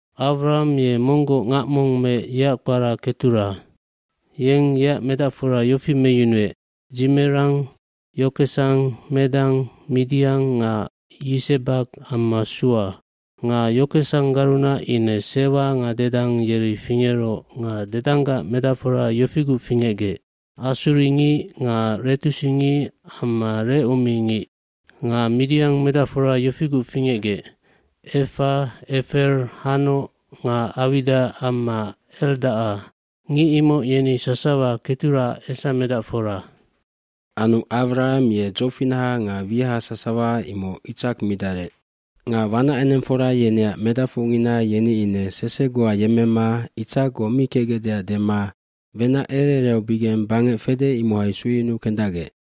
Awraham ye monggoc ngac mong meec yeac kpara Ketura. aYeng yeac medacfora yofi meyunuec, Dzimeran, Yokesan, Medan, Midian nga Yisebak amma Sua. Nga Yokesanggarunac ine Sewa nga Dedan yeri fingeroc nga Dedanggac medacfora yofiguc fingecgec, assuringic nga letusingic amma lecummingic. Nga Midian medacfora yofiguc fingecgec, Efa, Efer, Hanoc nga Awida amma Eldaca, ngic imoc yeni sasawa Keturaac esamedacfora. Anu Awraham ye dzofinaha nga wiaha sasawa imoc Itsak midarec. Nga wanacenengfora yeneac medacfocngina yeni ine sese goa yemmema Itsakgoc mi kecgecdeac dema wenac ere ereaubigeng bangec fede imohai sueyunuu kendacgec.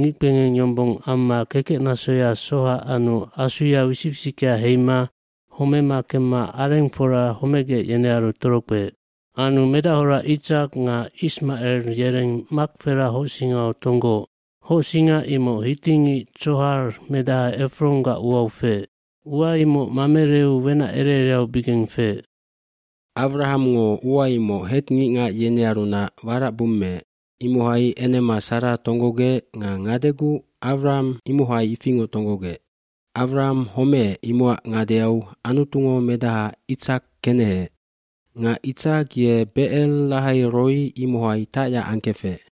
ngickpengeng yombong amma kekecnasoya soha anu asuya wisic wisickea heima homema kemma arengfora homegec yenearu torokpeec. bAnu medachora Itsak nga Ismacel yereng Mahpela hocsingau tonggooc. Hocsinga imoc hitingic Tsohar medaha Efronggac uau feec. Ua imoc Mamereu wenac ere ereaubigeng feec. cAwrahamngo ua imoc Het ngicngac yenearunac warac bummeec. Imohai enema Sara tonggogec nga ngadeguc Awraham imohai ifingoc tonggogec. dAwraham homeec imocac ngadeau Anutungo medaha Itsak keneheec. Nga Itsak ye Becer Lahai Roi imohai tacyac angkefec.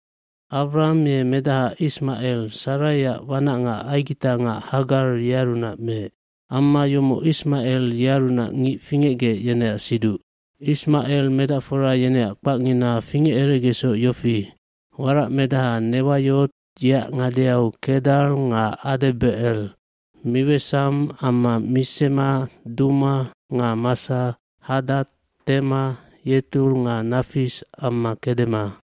Awraham ye medaha Ismacel Saraiac wanacngac aigitangac Hagar yearunac meec. Amma yomoc Ismacel yearunac ngic fingecgec yeneac siduc. Ismacel medacfora yeneac kpacngina fingeceregecsoc yofi, waracmedaha Newayot yeac ngadeau Kedar nga Adebecel, Miwesam, amma Misema, Duma nga Massa, Hadad, Tema, Yetur nga Nafis amma Kedema.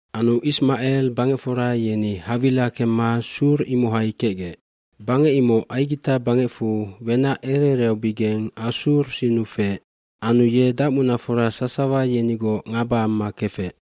fAnu Ismacel bangecfora yeni Hawila kemma Sur imohai kecgec. Bangec imoc Aigita bangecfu wenac ere ereaubigeng Assur sinnu feec. Anu ye dacmunafora sasawa yenigoc ngaba amma kefec.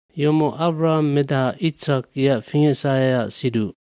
gYomoc Awraham medaha Itsak yeac fingecsaheac siduc.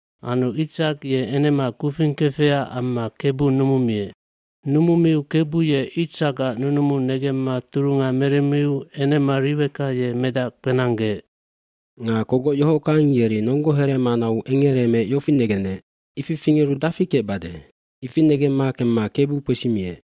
iAnu Itsak ye enema kufing kefecac amma Kebu numumiec. Numumiu Kebu ye Itsakac nunumu negemma turunga meremmiu enema Riweka ye medac kpenanggeec. Nga kogoc yohockang yeri nonggo heremanau engereemeec yofi negenec, “Ifi fingeru dafi kecbade?” Ifi negemma kemma Kebu kpesimiec.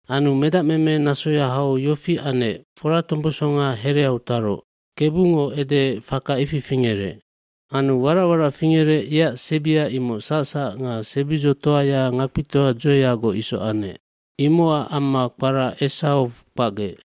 Anu medacmeme nasoya hau yofi anec foratombosonga hereau taroc. Kebungo edeec, faka ifi fingerec. Anu warac warac fingerec yeac sebia imoc sacsac nga sebidzotoaya ngakpitoa dzoeyagoc isoc anec. Imocac amma kpara Esawk kpacgec.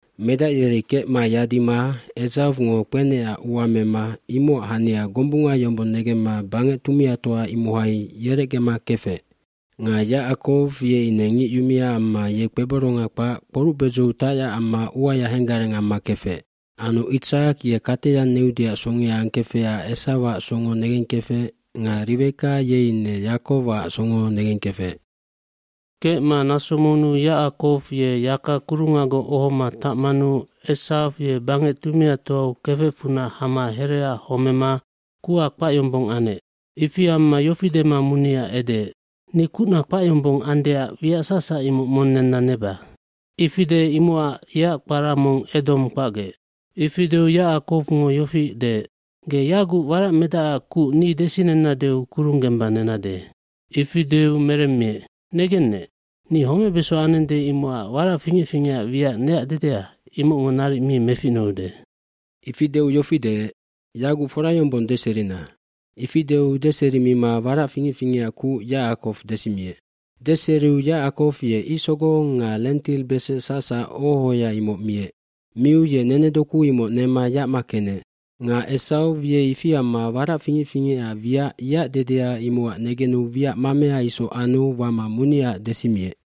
Medac yeri kecma yadima Esawngo kpenecac ua mema imocac hania gombunga yombong negemma bangec tumiatoa imohai yerecgema kefec. Nga Yacakow ye ine ngic yumia amma ye kpeboronga kpac kporucbedzou tacyac amma uaya henggareng amma kefec. Anu Itsak ye kateyang neudeac songea angkefecac Esawac songo negengkefec nga Riweka ye ine Yacakowac songo negengkefec. Kecma naso monnu Yacakow ye yaka kurungagoc ohoma tacmanu Esaw ye bangec tumiatoau kefecfunac hama hereaac homema kuha kpac yombong anec. Ifi amma yofi dema munia edeec, “Ni kucna kpac yombong andeac wiac sacsac imoc mong nenna neba.” Ifi deec imocac yeac kpara mong Edomn kpacgec. Ifi deu Yacakowngo yofi deec, “Ge yaguc waracmedacac kuc ni desinennadeu kurung gemba nenade.” Ifi deu meremmiec, “Negennec, ni homebeso anende imocac warac fingec fingecac wiac neac dedea imocngo naric mi meficnuude.” oIfi deu yofi deec, “Yaguc fora yombong deserina.” Ifi deu deserimima warac fingec fingecac kuc Yacakow desimiec. Deseriu Yacakow ye icsogong nga lentilbesecp sacsac oho ohoya imoc miec. Miu ye nenedoku imoc nema yacma kenec. Nga Esaw ye ifi amma warac fingec fingecac wiac yeac dedea imocac negenu wiac mamea isoc anu wama muniaac desimiec.